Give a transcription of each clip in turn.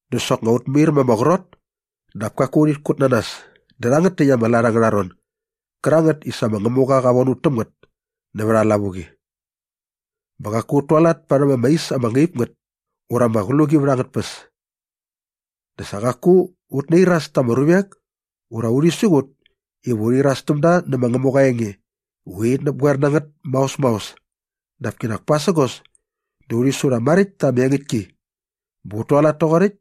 Dä soknga ut mair ma ama qrot dap kaku urhit kut na nas dä rhangät täkt ama lat angärha ron gärangät i sa ma Ngämuqa qa von ut täm ngät nävät aa lavuqi. Bä qaku ut tualat parhäm ama is ama ngaip ngät ura ama qluqi vät angät tpäs. Dä sa qaku ut nairas ta ama ruvek ura urhi siqut iva urhi iras täm da nä ma Ngämuqa aa enge i urhit näpgoer na ngät maos maos dap kinak pasägos di urhi su rha maräkt ta ama engäktki bä ut tualat toqoräkt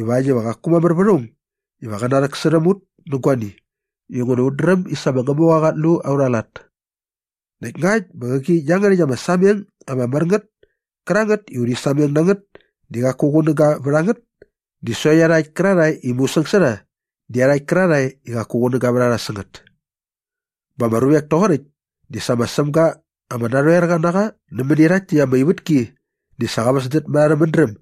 ivakt iva qaku mamär vät aung iva qä rhäksärhäm ut nä guani inguna ut dräm i sa ma Ngämuqa qat lu aurha lat. Näkt ngakt bä qäqi iangärhäkt ama sameng ama mär ngät kärangät i urhi sameng na ngät di qaku qunäga vät a ngät di sokt iarhakt kärarhae i mungsäs sä rha di iarhakt kärarhae i qaku qunäga vät a rha sä ngät. Bä ama ruvek toqoräkt di sa ma Sämga ama narhoerqa na qa nämäni rhakt täkt ama ivätki di sa qa väsdät mät arhä mädräm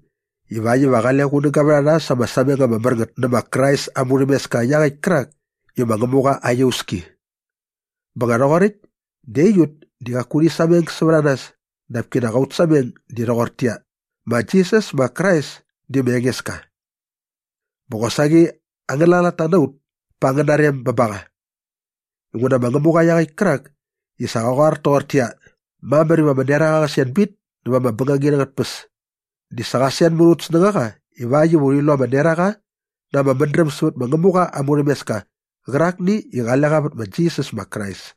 ivakt iva qale qunäga vät a rha sa ama sameng ama mär ngät nä ma Krais aa murhämeska iaqäkt kärak i ma Ngämuqa aa iauski. Bä nga rhoqoräkt dä aiut di qaku urhi sameng sävät a nas dap kinak aut sameng di rhoqortäqyia, ma Jisas ma Krais di ma Engeska. Bä qosaqi angäna latta na ut pa angäna rem bä ba qa. Inguna ma Ngämuqa iaqäkt kärak i sa qa qoar toqortäqyia, “Mamär iva ama neraqa qä sen bit näva ama bängangit angät tpäs” di sa qa sen mät aut snängaqa ivakt iva urhi lu ama neraqa na ama mädräm sävät ma Ngämuqa aa murhämeska qärakni i qale qa vät ma Jisas ma Krais.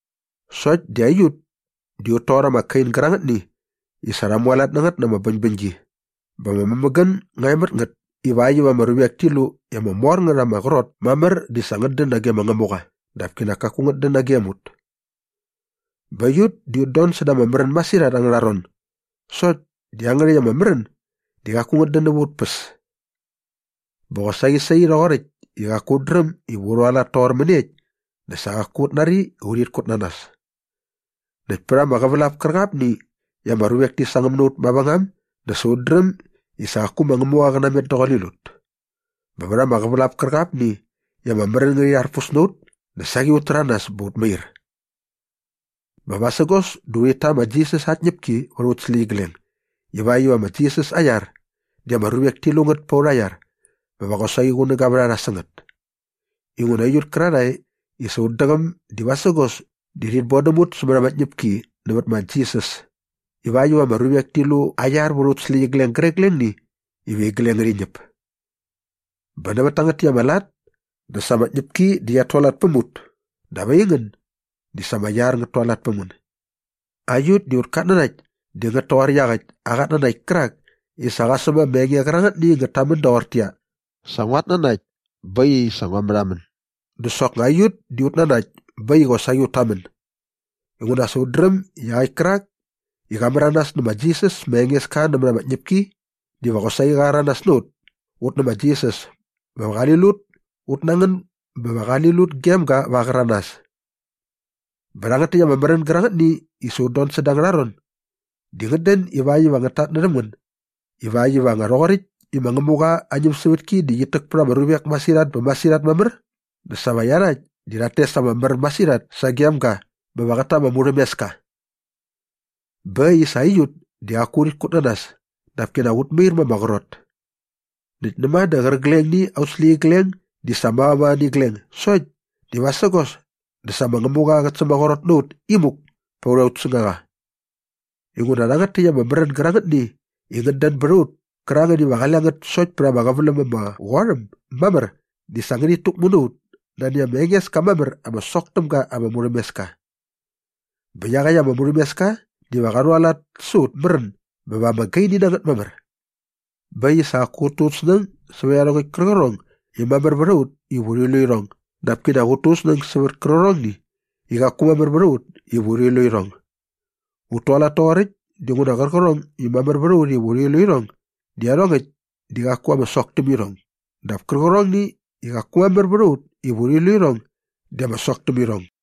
Sokt di aiut di ut toqor ama kain gärangätni i sa rha mualat na ngät na ama bäñbäñgi bä ama mämägän nga e mät ngät ivakt iva ama ruvek ti lu i ama mor ngät ama qrot mamär di sa ngät dän nage ma Ngämuqa dap kinak kaku ngät dän nagem ut. Bä aiut di ut don säda ama märän masirhat angärha ron sokt di iangärhäkt ama märän di qaku ngät dän näva aut päs. Bä qosaqi sai rhoqoräkt i qaku ut dräm iva u rhualat toqor mäniekt dä sa qaku ut nari i urhit kut na nas. Näkt pät ama qävälap kärqapni i ama ruvek ti sangäm na ut mavängam dä sa ut dräm i sa qaku ma Ngämuqa qä namet daqule lut. Bä vät ama qävälap kärqapni i ama märän ngärhi rharpus na ut dä saqi ut täranas bä ut mair. Bä vasägos dä urhit ta ma Jisas aa tñäpki vät aut släqyigleng ivakt iva ma Jisas aa iar di ama ruvek ti lu ngät pät aurha iar bä va qosaqi qunäga vät a rha sä ngät. Inguna aiut kärarhae i sa ut däqäm di vasägos di rhit bodäm ut sämät ama tñäpki nävät ma Jisas ivakt iva ama ruvek ti lu aa iar vät aut släqyigleng gärqiglengni iva igleng ngärhi ñäp. Bä nävät tangät täkt ama lat dä sa ama tñäpki di qiat tualat päm ut dap aingän di sa ama iar ngät tualat päm ngän. Aiut di aut katnanakt di ngät toqor iaqäkt aa qatnanakt kärak i sa qa säm ama enge qärangätni i ngät tamän doqortäqyia, “Sa nguat nanakt bä äkt i sa ngua märhamän” dä soknga aiut di ut nanakt bä äkt i qosaqi ut tamän inguna sa ut dräm i iaqäkt kärak i qa märanas nä ma Jisas ma Engeska nämät ama tñäpki diva qosaqi qa rhäranas na ut ut nä ma Jisas bä va qä rhal ut ut na ngän bä va qali lut gem ga va aa qäranas. Bä rhangät täkt ama märän gärangätni i sa ut don säda angärha ron di ngät dän ivakt iva ngät tatnärhäm ngän ivakt iva nga rhoqoräkt i ma Ngämuqa aa ñämsävätki di qit täk pät ama ruvek masirhat bä masirhat mamär dä sa va iarhakt di rhat tes ama mär masirhat sagem ga bä va qät ta ama murhämeska. Bä äkt i sa aiut di qaku urhit kut na nas dap kinak ut mair ma ama qrot. Näkt näma dä qärqigleng aut släqyigleng di sa mavamava nä igleng sokt di vasägos dä sa ma Ngämuqa qät sämaqrot na ut imuk pät aut snängaqa. Inguna rhangät täkt ama märän gärangätni i ngät dän bät a ut kärangät iva qale ngät sokt pät ama qäväläm ama qot äm mamär di sa ngärhit täkmu na ut nani ama enges ka mamär ama sok täm ga ama murhämeska. Bä iaqäkt ama murhämeska diva qa rhualat sa aut märän bä va ama gaini na ngät mamär. Bä äkt i sa qaku ut tu ut snäng sävät iarhongäkt kärqärhong i mamär vät a ut iva urhi lu irhong dap kinak ut tu ut snäng sävät kärqärhongni i qaku mamär vät a ut iva urhi lu irhong. Ut tualat toqoräkt dinguna qärqärhong i mamär vät a ut iva urhi lu irhong di iarhongäkt di qaku ama sok täm irhong dap kärqärhong i qaku mamär vät a ut iva urhi lu irhong di ama sok täm irhong.